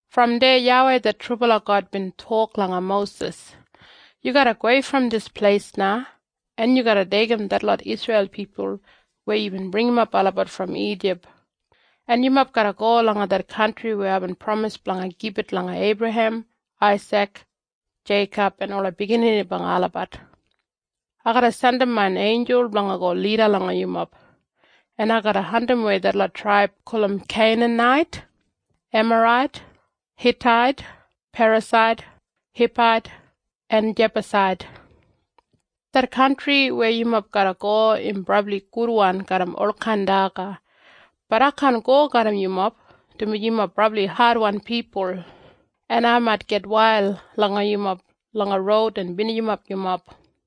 Brom deya YAWEI det trubala God bin tok langa Mosis, “Yu garra gowei brom dis pleis na, en yu garra deigim detlot Isreil pipul weya yubin bringimap olabat brom Ijip, en yumob garra go langa det kantri weya aibin pramis blanga gibit langa Eibrahem, Aisik, Jeikob en ola biginini blanga olabat. Ai garra jandim main einjul blanga go lida langa yumob, en ai garra andimwei detlot traib gulum Keinanait, Emarait, Hitait, Perasait, Hibait en Jebusait. Det kantri weya yumob garra go im brabli gudwan garram olkain daga. Bat ai kaan go garram yumob, dumaji yumob brabli adwan pipul, en ai mait gitwail langa yumob langa roud en binijimap yumob.”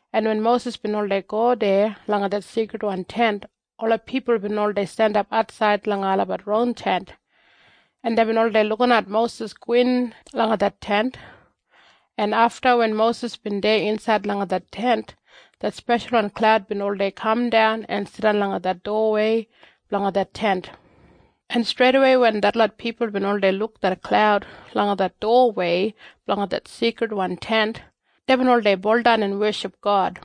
en wen Mosis bin oldei go deya langa det Seikridwan Tent, ola pipul bin oldei jandap atsaid langa olabat ron tent, en deibin oldei lukinat Mosis gowin langa det Tent, en afta wen Mosis bin deya insaid langa det Tent, det speshalwan klaud bin oldei kamdan en jidan langa det dowawei blanga det Tent, en streidawei wen detlot pipul bin oldei luk det klaud langa det dowawei blanga det Seikridwan Tent, deibin oldei baudan en weship God.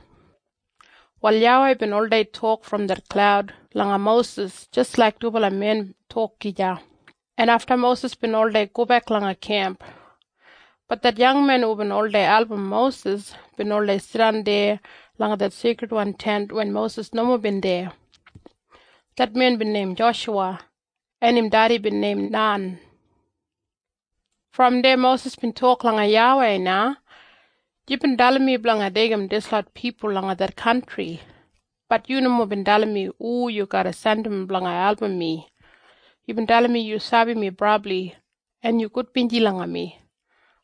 Wal YAWEI bin oldei tok brom det klaud langa Mosis jis laik dubala men tok gija, en afta Mosis bin oldei gobek langa kemp. Bat det yangmen hubin oldei album Mosis bin oldei jidan deya langa det Seikridwan Tent wen Mosis nomo bin deya. Det men bin neim Joshuwa, en im dedi bin neim Nan. Brom deya Mosis bin tok langa YAWEI na, “Yubin dalim mi blanga deigim dislot pipul langa det kantri. Bat yu nomo bin dalim mi hu yu garra jandim blanga album mi. Yubin dalim mi yu sabi mi brabli, en yu gudbinji langa mi.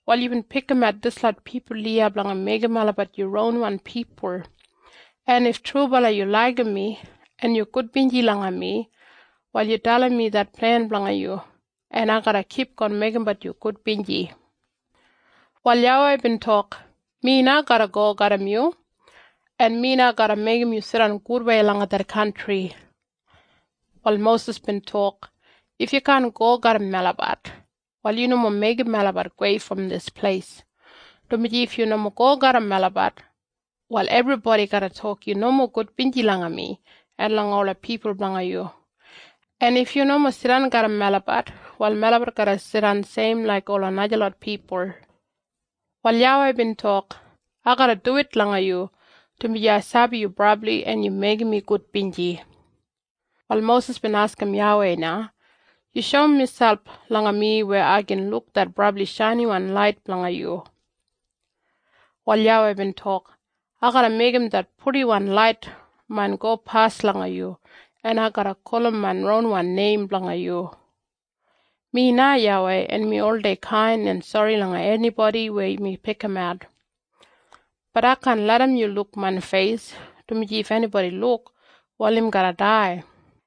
Wal yubin pikimat dislot pipul iya blanga meigim olabat yu ronwan pipul, en if trubala yu laigim mi, en yu gudbinji langa mi, wal yu dalim mi det plen blanga yu, en ai garra kipgon meigimbat yu gudbinji.” Wal YAWEI bin tok, “Mi na garra go garram yu, en mi na garra meigim yu jidan gudwei langa det kantri.” Wal Mosis bin tok, “If yu kaan go garram melabat, wal yu nomo meigim melabat gowei brom dis pleis, dumaji if yu nomo go garram melabat, wal ebribodi garra tok yu nomo gudbinji langa mi en langa ola pipul blanga yu, en if yu nomo jidan garram melabat, wal melabat garra jidan seim laik ola najalot pipul.” Wal YAWEI bin tok, “Ai garra duwit langa yu, dumaji ai sabi yu brabli, en yu meigim mi gudbinji.” Wal Mosis bin askim YAWEI na, “Yu shoum miselp langa mi weya ai gin luk det brabli shainiwan lait blanga yu.” Wal YAWEI bin tok, “Ai garra meigim det purdiwan lait main gopas langa yu, en ai garra gulum main ronwan neim blanga yu. Mi na YAWEI, en mi oldei kain en sori langa enibodi weya mi pikimat. Bat ai kaan larram yu luk main feis, dumaji if enibodi luk, wal im garra dai.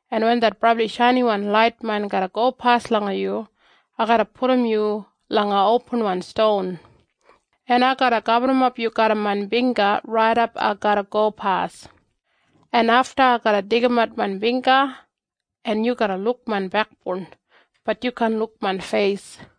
en wen det brabli shainiwan lait main garra gopas langa yu, ai garra pudum yu langa opinwan ston, en ai garra gaburrumap yu garram main bingga raidap ai garra gopas, en afta ai garra deigimat main bingga, en yu garra luk main bekboun. Bat yu kaan luk main feis.”